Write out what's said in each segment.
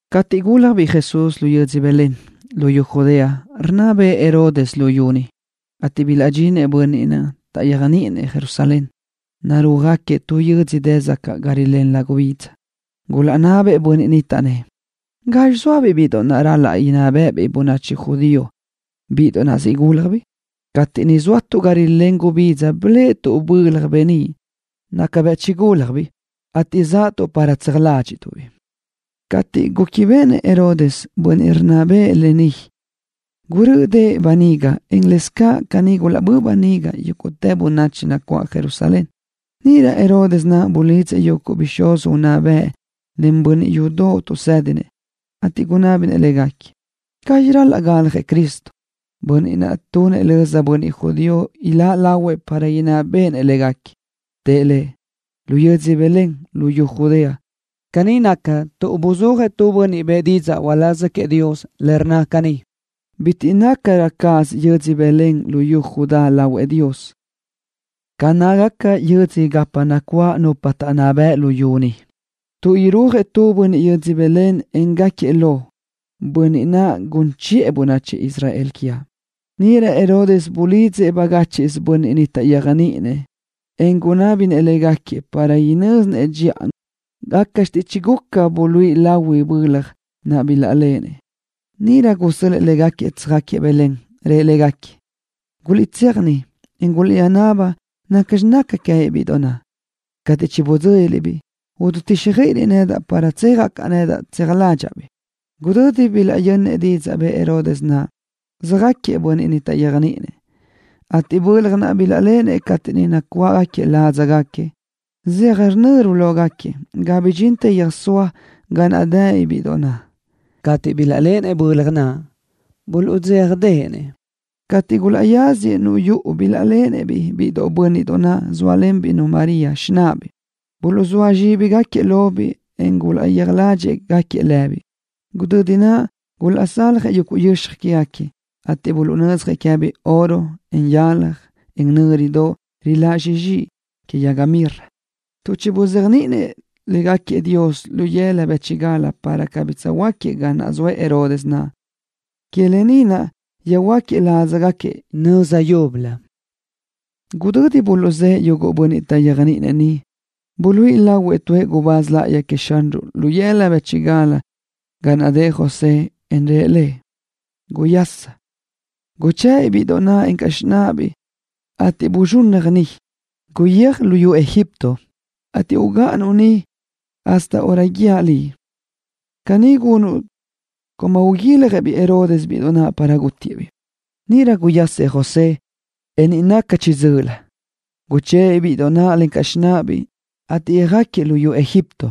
Cateʼ gúljabiʼ Jesús lu yödzö Belén, luyú Judea, rinná bëʼë Herodes luyú niʼ, ateʼ bilaʼdxinëʼ bönniʼ taʼyéajniʼinëʼ Jerusalén, narúajgaquiëʼ tu yödzö dë sacaʼ ga rilén gubidza. Gulaʼnabëʼ bönniʼ ni, taʼnnë́ʼ: —¿Gazxi zóabiʼ bíʼidoʼ naʼ ral-laʼ inná béʼebiʼ bönachi judío, bíʼidoʼ naʼ siʼ gúljabiʼ? Cateʼ niʼ zóatuʼ ga rilén gubidza biléʼetuʼ-baʼ bölaj beníʼ naca bëʼ chigúlajbiʼ, ateʼ zaʼtuʼ ni para tseaj ládxiʼtuʼ-biʼ. Cateʼ gúquibeʼenëʼ Herodes, bönniʼ rinná bëʼë, lë ni, gurö́ʼödëʼ böniga, en lëscaʼ caní gulaʼbö́ʼ böniga yúguʼtë bönachi nacuáʼ Jerusalén. Níʼirö Herodes naʼ bulidzëʼ yúguʼtë bixúz unná bëʼ, len bönniʼ yudoʼ tuʼsédinëʼ, ateʼ gunábinëʼ légaquiëʼ gazxi ral-laʼ galjëʼ Cristo, bönniʼ naʼ tunëʼ löza bönniʼ judío iláʼ lahuëʼ para inná béʼenëʼ légaquiëʼ. Tëʼ lëʼ: —Lu yödzö Belén luyú Judea. Caní naca tuʼ buzúajëʼ tu bönniʼ bëʼë didzaʼ uláz queëʼ Dios le rnna caní: Bitiʼ nácarö cáʼasö yödzö Belén luyú Judá lahuëʼ Dios ca nácagaca yödzö gapa nacuáʼ nupa taʼnná bëʼ luyú ni, tuʼ irúajëʼ tu bönniʼ yödzö Belén, en gáquiëʼ lo, bönniʼ naʼ gun chiʼë bönachi Israel quiaʼ. Níʼirö Herodes bulidzëʼ bagáchiʼsö bönniʼ taʼyéajniʼinëʼ naʼ, en gunábinëʼ légaquiëʼ para inö́zinëʼ dxiʼa gácaʼxte chiguca buluíʼi lahui bölaj naʼ bilaʼléʼenëʼ. Níʼirö gusö́l-lëʼë légaquiëʼ tsöjáquiëʼ Belén. Rëʼ légaquiëʼ: —Guliʼtséaj niʼ, en guliʼtsöjnaba dxiʼa nacxi naca queë́biʼ bíʼidoʼ naʼ. Cateʼ chibidzö́liliʼ-biʼ, ididíxjöiʼiliʼ nedaʼ, para tsejaʼ caʼ nedaʼ, tseaj ládxaʼa-biʼ. Gudödi bilaʼyönnëʼ didzaʼ bëʼë Herodes naʼ, söjáquiëʼ bönniʼ taʼyéajniʼinëʼ naʼ, ateʼ bölaj naʼ bilaʼléʼenëʼ cateʼ niʼ nacuʼë ládzagaquiëʼ söjnö́rubaʼ lógaquiëʼ ga bidxintë yöjsóa ga naʼ dëbiʼ bíʼidoʼ naʼ. Cateʼ bilaʼléʼenëʼ bölaj naʼ, buluʼdzéjadeʼenëʼ. Cateʼ gulaʼyáziëʼ yuʼu, bilaʼléʼenëʼ-biʼ biʼi bö́nniʼdoʼ naʼ, zóalenbiʼ-nu María, xináʼabiʼ. Buluʼzóa zxíbigaquiëʼ lobiʼ, en gulaʼyéaj ládxiʼgaquiëʼ-biʼ. Gudödi naʼ gulaʼsaljëʼ yuguʼ yöxaj quégaquiëʼ, ateʼ buluʼnödzjëʼ queë́biʼ oro, en yalaj, en nö́ridoʼ riláʼ zxixi que yaga mirra. Tuʼ chibuzéajniʼinëʼ Dios légaquiëʼ lu yëla bë́chigal para cabí tsöjhuö́jquiëʼ ga zoëʼ Herodes naʼ, que lë ni naʼ yöjhuö́jquiëʼ ládzagaquiëʼ nöza yúbölö. Gudödi buluʼzë́ʼë yuguʼ bönniʼ taʼyéajniʼinëʼ niʼ, buluíʼi lahuëʼ tuëʼ gubáz láʼayi queëʼ Xanruʼ lu yëla bë́chigal, ga naʼ dëʼ José, en rëʼ lëʼ: —Guyaschi. Guchë́ʼ-biʼ bíʼidoʼ ni, encaʼ xináʼabiʼ, ateʼ buzxunnaj ni. Guyéaj luyú Egipto, ateʼ ugáʼanuʼ niʼ cateʼ guië́raʼ liʼ iaʼtú. Caní gunuʼ tuʼ uguiljëʼ Herodes bíʼidoʼ ni para gútiëʼ-biʼ. Níʼirö guyasëʼ José, en niʼ naca chiʼi dzö́ʼölö, guchë́ʼë-biʼ bíʼidoʼ naʼ, encaʼ xináʼabiʼ, ateʼ yöjáquiëʼ luyú Egipto.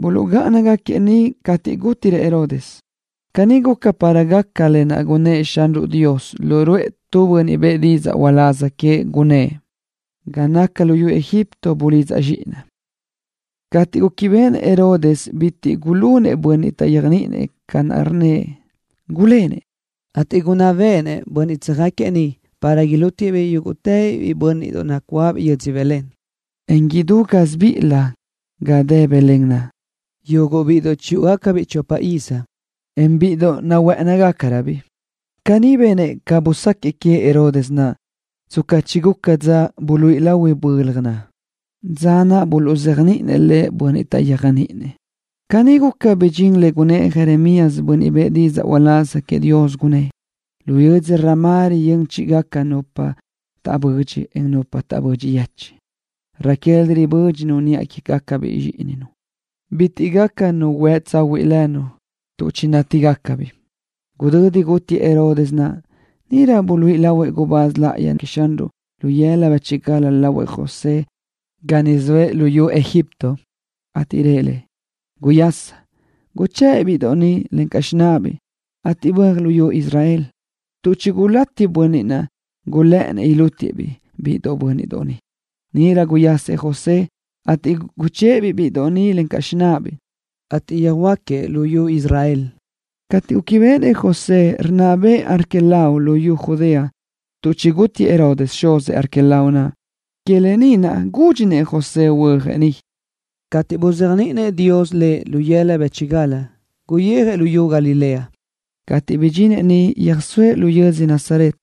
Buluʼgáʼanëʼ niʼ cateʼ gútirëʼ Herodes. Caní guca para gaca lë naʼ gunnë́ʼ Xanruʼ Dios lu ruʼë tu bönniʼ bëʼë didzaʼ uláz queëʼ, gunnë́ʼ: “Ga naca luyú Egipto bulidzaʼ Zxíʼinaʼ.” Cateʼ gúquibeʼenëʼ Herodes bitiʼ gulunëʼ bönniʼ taʼyéajniʼinëʼ ca rnnëʼ, gulénëʼ, ateʼ gunná béʼenëʼ bönniʼ tsöjáquiëʼ niʼ para ilútiëʼ-biʼ yúguʼtëbiʼ biʼi bö́nniʼdoʼ nacuáʼabiʼ yödzö Belén, en idú gásibiʼilö ga dë Belén naʼ, yuguʼ bíʼidoʼ chiyúʼugacabiʼ chopa iz, en bíʼidoʼ nahuë́ʼënigacaröbiʼ. Caní benëʼ ca busáquiëʼ queëʼ Herodes naʼ, tsca chiguca dza buluíʼi lahui bölaj naʼ, dza naʼ buluʼzéajniʼinëʼ bönniʼ taʼyéajniʼinëʼ naʼ lëʼ. Caní guca, bidxín lë naʼ gunnë́ʼ Jeremías, bönniʼ bëʼë didzaʼ uláz queëʼ Dios, gunnë́ʼ: Lu yödzö Ramá riyö́n chíʼigaca nupa taʼbödxi, en nupa taʼbödxi yechiʼ. Raquel ribö́dxinu niʼa quégacabiʼ zxíʼininu. Bitiʼ gaca nu huë tsahuiʼ lënu, tuʼ chinátigacabiʼ. Gudödi gútiëʼ Herodes naʼ, níʼirö buluíʼi lahuëʼ gubáz láʼayi naʼ queëʼ Xanruʼ lu yëla bë́chigal lahuëʼ José ga niʼ zoëʼ luyú Egipto, ateʼ rëʼ lëʼ: —Guyasa. Guchë́ʼ-biʼ biʼi bö́nniʼdoʼ ni, encaʼ xináʼabiʼ, ateʼ böaj luyú Israel, tuʼ chigulátiëʼ bönniʼ niʼ gulë́ʼënnëʼ ilútiëʼ-biʼ biʼi bö́nniʼdoʼ ni. Níʼirö guyasëʼ José, ateʼ guchë́ʼë-biʼ biʼi bö́nniʼdoʼ naʼ, encaʼ xináʼabiʼ, ateʼ yöhuö́jquiëʼ luyú Israel. Cateʼ gúquibeʼenëʼ José rinná bëʼë Arquelao luyú Judea tuʼ chigútiëʼ Herodes, xuzëʼ Arquelao naʼ, que lë ni naʼ gúdxinëʼ José huöjëʼ niʼ. Cateʼ buzéajniʼinëʼ Dios lëʼ lu yëla bë́chigal, guyijëʼ luyú Galilea. Cateʼ bidxinëʼ niʼ, yöjsóëʼ lu yödzö Nazaret.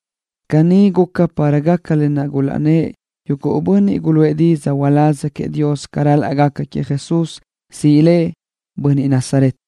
Caní guca para gaca lë naʼ gulaʼnnë́ʼ yuguʼ bönniʼ guluʼë didzaʼ uláz queëʼ Dios ca ral-laʼ gaca queëʼ Jesús, siʼ Lëʼ, Bönniʼ Nazaret.